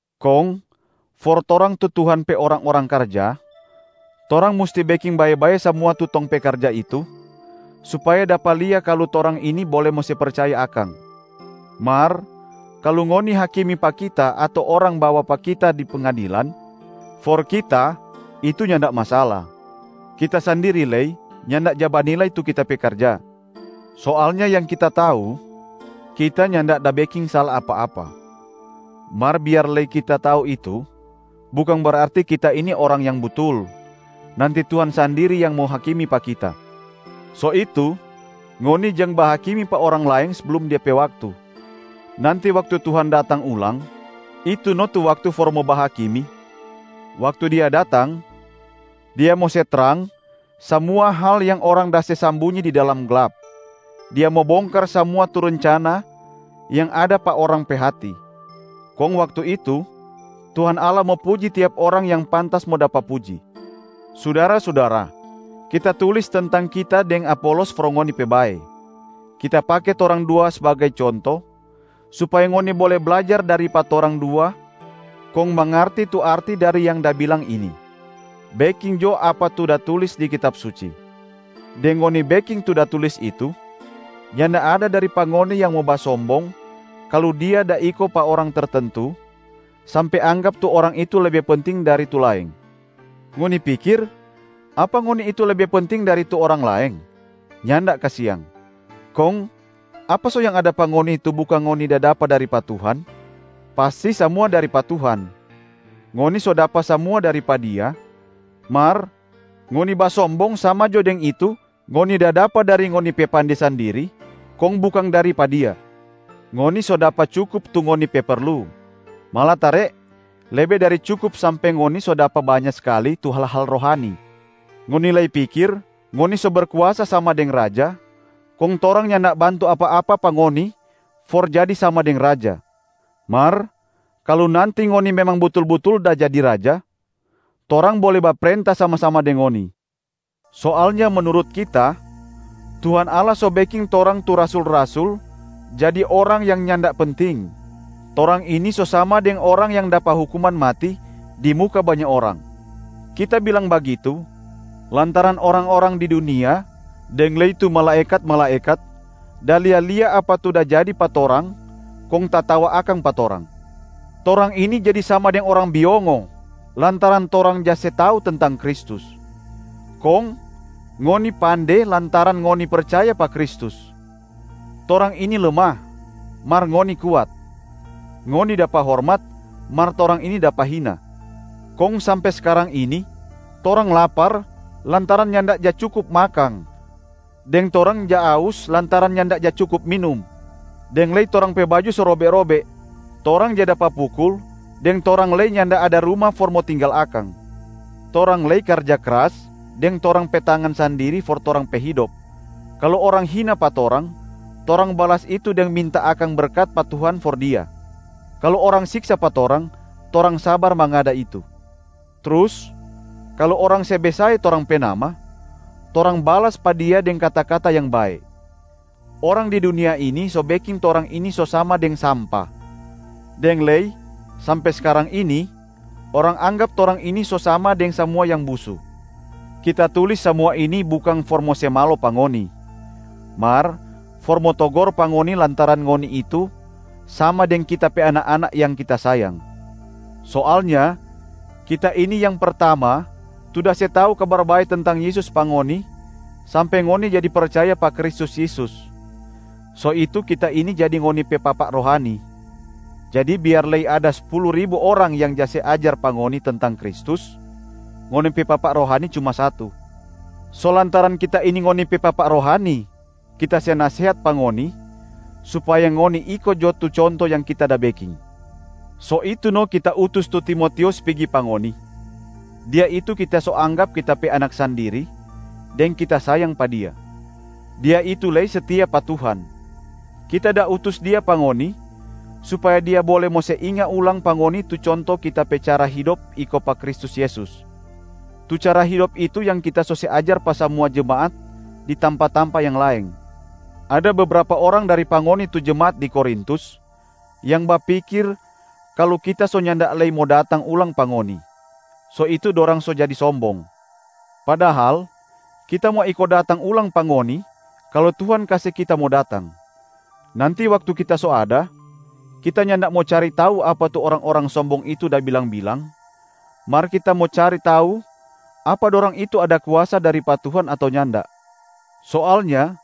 Kong for torang tu Tuhan pe orang-orang karja, torang musti beking bae-bae samua tu tong pe karja itu, supaya dapa lia kalu torang ini bole mo se percaya akang. Mar kalu ngoni hakimi pa kita ato orang bawa pa kita di pengadilan, for kita itu nyanda masala. Kita sandiri lei nyanda ja banilai tu kita pe karja. Soalnya yang kita tau, kita nyanda da beking sala apa-apa. Mar biar lei kita tau itu, bukang berarti kita ini orang yang butul, nanti Tuhan sandiri yang mo hakimi pa kita. So itu, ngoni jang bahakimi pa orang laeng seblum de pe waktu. Nanti waktu Tuhan datang ulang, itu no tu waktu for mo bahakimi. Waktu Dia datang, Dia mo se trang samua hal yang orang da se sambunyi di dalam glap, Dia mo bongkar samua tu rencana yang ada pa orang pe hati. Kong waktu itu, Tuhan Allah mo puji tiap orang yang pantas mo dapa puji. Sudara-sudara, kita tulis tentang kita deng Apolos for ngoni pe bae. Kita pake torang dua sbagai conto, supaya ngoni bole blajar dari pa torang dua kong mangarti tu arti dari yang da bilang ini, “Beking jo apa tu da tulis di Kitab Suci.” Deng ngoni beking tu da tulis itu, nyanda ada dari pa ngoni yang mo basombong kalu dia da iko pa orang tertentu, sampe anggap tu orang itu lebe penting dari tu laeng. Ngoni pikir, apa ngoni itu lebe penting dari tu orang laeng? Nyanda kasiang. Kong apa so yang ada pa ngoni tu bukang ngoni da dapa dari pa Tuhan? Pasti samua dari pa Tuhan. Ngoni so dapa samua dari pa Dia, mar ngoni basombong sama jo deng itu ngoni da dapa dari ngoni pe pande sandiri kong bukang dari pa Dia. Ngoni so dapa cukup tu ngoni pe perlu, malatare lebe dari cukup sampe ngoni so dapa banya skali tu hal-hal rohani. Ngoni lei pikir ngoni so berkuasa sama deng raja, kong torang nyanda bantu apa-apa pa ngoni for jadi sama deng raja. Mar kalu nanti ngoni memang butul-butul da jadi raja, torang bole baprenta sama-sama deng ngoni. Soalnya menurut kita, Tuhan Allah so beking torang tu rasul-rasul jadi orang yang nyanda penting, torang ini so sama deng orang yang dapa hukuman mati di muka banya orang. Kita bilang bagitu lantaran orang-orang di dunia deng lei tu malaekat-malaekat da lia-lia apa tu da jadi pa torang kong tatawa akang pa torang. Torang ini jadi sama deng orang biongo lantaran torang ja se tau tentang Kristus. Kong ngoni pande lantaran ngoni percaya pa Kristus. Torang ini lemah, mar ngoni kuat. Ngoni dapa hormat, mar torang ini dapa hina. Kong sampe skarang ini, torang lapar lantaran nyanda ja cukup makang deng torang ja aus lantaran nyanda ja cukup minum, deng lei torang pe baju so robe-robe. Torang ja dapa pukul deng torang lei nyanda ada ruma for mo tinggal akang. Torang lei karja kras deng torang pe tangan sandiri for torang pe hidop. Kalu orang hina pa torang, torang balas itu deng minta akang berkat pa Tuhan for dia. Kalu orang siksa pa torang, torang sabar mangada itu. Trus kalu orang se besae torang pe nama, torang balas pa dia deng kata-kata yang bae. Orang di dunia ini so beking torang ini so sama deng sampa, deng lei sampe skarang ini orang anggap torang ini so sama deng samua yang busu. Kita tulis samua ini bukang for mo se malo pa ngoni, mar for mo togor pa ngoni lantaran ngoni itu sama deng kita pe anak-anak yang kita sayang. Soalnya kita ini yang pertama tu da se tau Kabar Bae tentang Yesus pa ngoni sampe ngoni jadi percaya pa Kristus Yesus, so itu kita ini jadi ngoni pe papa rohani. Jadi biar lei ada spulu ribu orang yang ja se ajar pa ngoni tentang Kristus, ngoni pe papa rohani cuma satu. So lantaran kita ini ngoni pe papa rohani, kita se nasehat pa ngoni supaya ngoni iko jo tu conto yang kita da beking. So itu no kita utus tu Timotius pigi pa ngoni. Dia itu kita so anggap kita pe anak sandiri deng kita sayang pa dia. Dia itu lei setia pa Tuhan. Kita da utus dia pa ngoni supaya dia bole mo se inga ulang pa ngoni tu conto kita pe cara hidop iko pa Kristus Yesus. Tu cara hidop itu yang kita so se ajar pa samua jemaat di tampa-tampa yang laeng. Ada bebrapa orang dari pa ngoni tu jemaat di Korintus yang bapikir kalu kita so nyanda lei mo datang ulang pa ngoni, so itu dorang so jadi sombong. Padahal kita mo iko datang ulang pa ngoni kalu Tuhan kase kita mo datang. Nanti waktu kita so ada, kita nyanda mo cari tau apa tu orang-orang sombong itu da bilang-bilang, mar kita mo cari tau apa dorang itu ada kuasa dari pa Tuhan ato nyanda. Soalnya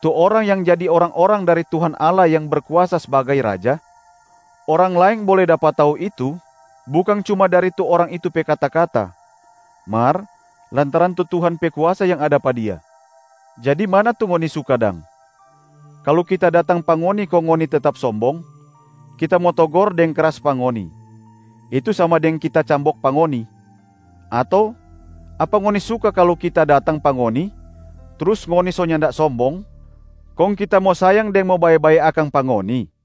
tu orang yang jadi orang-orang dari Tuhan Allah yang Berkuasa sbagai Raja, orang laeng bole dapa tau itu bukang cuma dari tu orang itu pe kata-kata, mar lantaran tu Tuhan pe kuasa yang ada pa dia. Jadi mana tu ngoni suka dang? Kalu kita datang pa ngoni kong ngoni tetap sombong, kita mo togor deng kras pa ngoni, itu sama deng kita cambok pa ngoni. Ato apa ngoni suka kalu kita datang pa ngoni trus ngoni so nyanda sombong, kong kita mo sayang deng mo babae-bae akang pa ngoni?